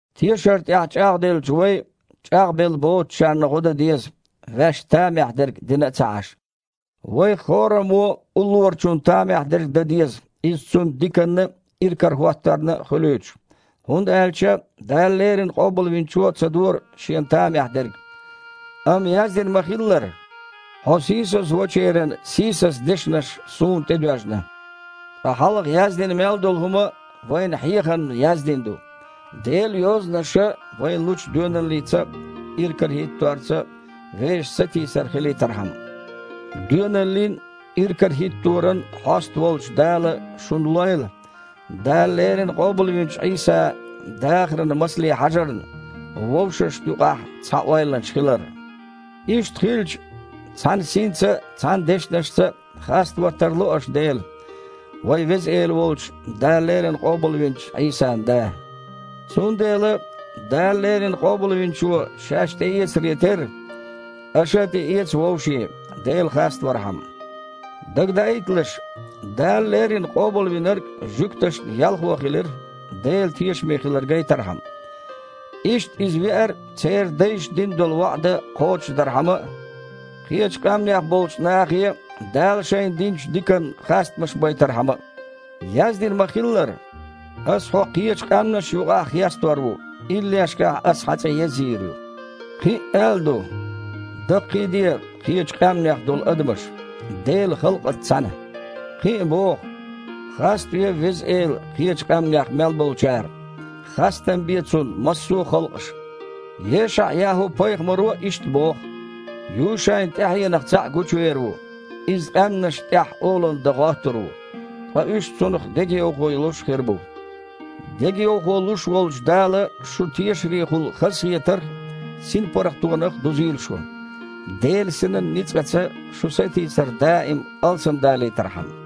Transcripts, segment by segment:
Тешар тІехь чІагІделлачу вай чІагІбелла боцучарна гІо дан деза, ваьшна тамехь дерг дина а ца Іаш. Вайх хІораммо а уллорачунна тамехь дерг дан деза, иза цунна диканна а, иракарахІотторна а хуьлуьйтуш. ХІунда аьлча Дала леррина Къобалвинчо а ца дора Шена тамехь дерг. Амма яздина ма-хиллара: «Хьо сийсазвочеран сийсаза дешнаш Суна тІедоьжна». Ткъа хьалха яздина мел долу хІума вайна хьехамна яздина ду, Делан Йозанаша вайна лучу доьналлица а, иракарахІитторца а вешан сатийсар хилийтархьама. Доьналлин а, иракарахІитторан а хьоста волчу Дала шуна лойла, Дала леррина къобалвинчу Іийсан дахаран масале хьажарна, вовшашна юкъахь цхьа ойланаш хилар. Иштта хилча, цхьана синца а, цхьана дешнашца а хаставан тарло аша Дела, вайн Веза Эла волчу, Дала леррина къобалвинчу Іийсан Да. Цундела, Дала леррина Къобалвинчо шаьш тІеэцаре терра, аша а тІеэца вовшийн, Дела хаставархьама. Дагадаийталаш, Дала леррина Къобалвинарг жуьгташна ялхо хилира, Дела тешаме хилар гайтархьама. Иштта, Иза веара, церан дайшна дина долу ваІда кхочушдархьама а, кхечу къаьмнех болчу нахе а Дала шайна динчу диканна хастамаш байтархьама а. Яздина ма-хиллара: «Аса Хьо кхечу къаьмнашна юкъахь хестор ву, иллешкахь ас Хьан цІе язйийр ю». Кхин а аьлла ду: «Даккхийде, кхечу къаьмнех долу адамаш, Делан халкъаца цхьаьна». Кхин а боху: «Хаставе Веза Эла кхечу къаьмнех мел болчара, хастам бе Цунна массо а халкъаша!». ЕшаІ-ЯхІу-пайхамаро а иштта боху: «Юшайн тІаьхьенах цхьаъ гучувер ву. Иза къаьмнашна тІехь олалла дан гІоттур ву, ткъа уьш цунах дегайовхо йолуш хир бу». Дегайовхо луш волчу Дала шун тешарехула хазахетарх а, синпаргІатонах а дузийла шу, Делан Синан ницкъаца шун сатийсар даим алсамдалийтархьама.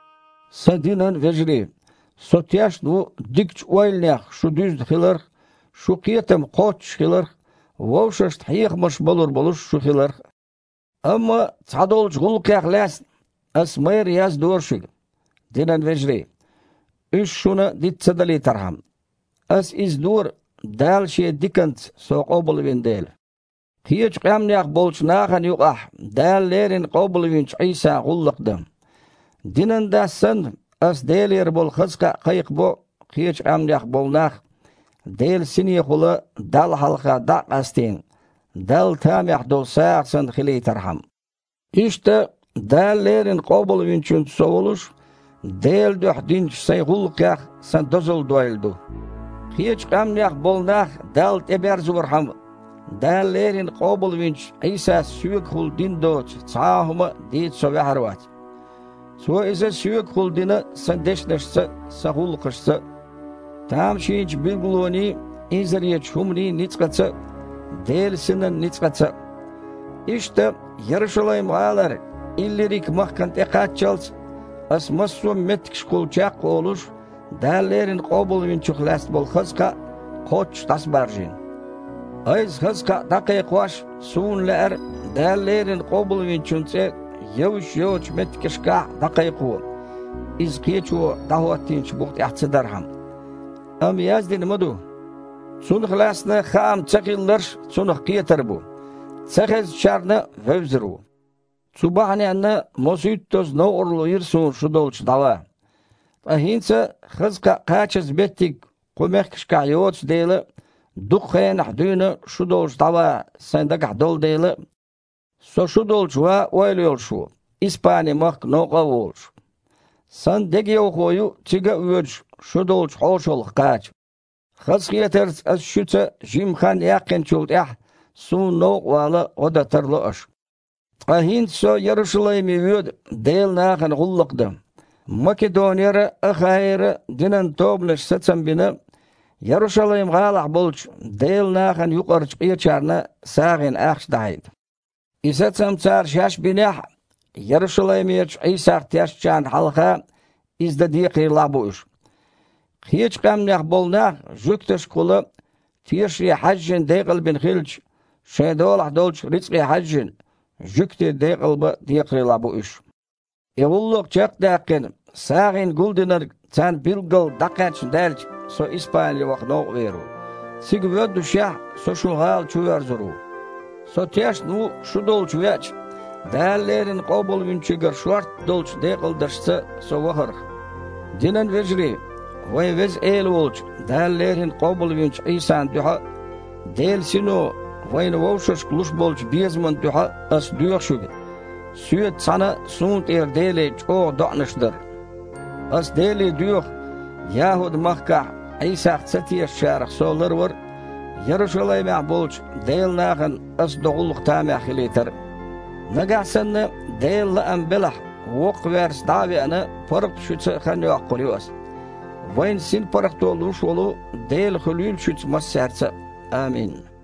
Сан динан вежарий, со тешна ву дикачу ойланех шу дуьзна хиларх а, шун кхетам кхоччуш хиларх а, вовшашна хьехамаш балур болуш шу хиларх а. Амма цхьадолчу гІуллакхех лаьцна аса майрра яздора шуьга, динан вежарий, уьш шуна диц ца далийтархьама. Аса иза дора, Дала Шен диканца со къобалвина дела, кхечу къаьмнех болчу нахана юкъахь Дала леррина къобалвинчу Іийсан гІуллакх дан. Динан дас санна, Ас Делера болу хаза кхаъ кхайкхабо, кхечу къаьмнех болу нах, Делан Синехула Далла хьалха дІа а къастийна, Далла тамехь долу сагІа санна хилийтархьама. Иштта Дала леррина Къобалвинчуьнца со волуш, Делан дуьхьа динчу сайн гІуллакхех сан дозалла дойла ду. Кхечу къаьмнех болу нах Далла тІеберзорхьама, Дала леррина къобалвинчу Іийсас соьгахула дина доцу цхьа а хІума дийца со ваьхьар вац. Цо иза соьгахула дина сан дешнашца а, сан гІуллакхашца а тамашийнчу билгалонийн а, инзаречу хІуманийн а ницкъаца а, Делан Синан ницкъаца а. Иштта, Ярушалайм-гІалара Иллирик-махкана тІекхаччалц, аса, массо а меттигашкахула чекх а волуш, Дала леррина Къобалвинчух лаьцна болу хаза кхаъ кхоччуш дІасабаржийна. Айса хаза кхаъ дІакхайкхош, суна лаьара Дала леррина Къобалвинчун цІе евзаш йоцучу меттигашкахь а дІакхайкхо, иза кхечо дІахІотийначу бух тІехь ца дархьама. Амма яздина ма ду: «Цунах лаьцна хаам цахилларш а Цунах кхетар бу, цахезначарна а вевзар ву». Цу бахьаненна мосуьйттазза новкъарло йира суна шу долчу дІаван. Ткъа хІинца хаза кхаъ кхачаза меттиг кху мехкашкахь йоцу дела а, дукха хенахь дуьйна шу долчу дІаван сан дагахь долу дела а, со шу долчу ван ойла йолуш ву, Испани-махка новкъа а волуш. Сан дегайовхо ю, цига а воьдуш, шу долчу хьошалгІа кхача. Хазахетарца ас шуьца жимма хан яьккхинчул тІаьхьа, суна новкъа вала гІо дан тарло аша. Ткъа хІинца со Ярушалайме воьду Делан нахана гІуллакх дан. Македонера а, Ахаера а динан тобанаша сацам бина, Ярушалайм-гІалахь болчу Делан нахана юкъарчу къечарна сагІина ахча дахьийта. И сацам цара шаьш бинехь а, Ярушалаймерчу Іийсах тешачарна хьалха иза дан декхарийлахь а бу уьш. Кхечу къаьмнех болу нах жуьгташкахула, тешаре хьаьжжина, декъалбина хилча, шайн долахь долчу рицкъе хьаьжжина, жуьгтий декъалбан а декхарийлахь бу уьш. И гІуллакх чекх а даьккхина, сагІина гулдинарг царна билггал дІакхаьчна даьлча, со Испани ваха новкъа вер ву. Цига воьддушехь, со шун гІала чувоьрзур ву. Со тешна ву, шу долчу веача, Дала леррина Къобалвинчуьнгара шортта долчу декъалдаршца со вахарх. Динан вежарий, вайн Веза Эла волчу, Дала леррина къобалвинчу Іийсан дуьхьа а, Делан Сино вайна вовшашка луш болчу безаман дуьхьа а аса доьху шуьга соьца цхьаьна суна тІера Деле чІогІа доІанаш дар. Аса Деле доьху, ЯхІуд-махкахь Іийсах ца тешачарах со ларвар а, Ярушалаймехь болчу Делан нахана ас до гІуллакх тамехь хилийтар а. Нагахь санна Делан лаам белахь, воккхаверца дІа а веана, паргІат шуьца хан йоккхур ю аса. Вайна синпаргІато луш волу Дела хуьлийла шуьца массаьрца а. Амин.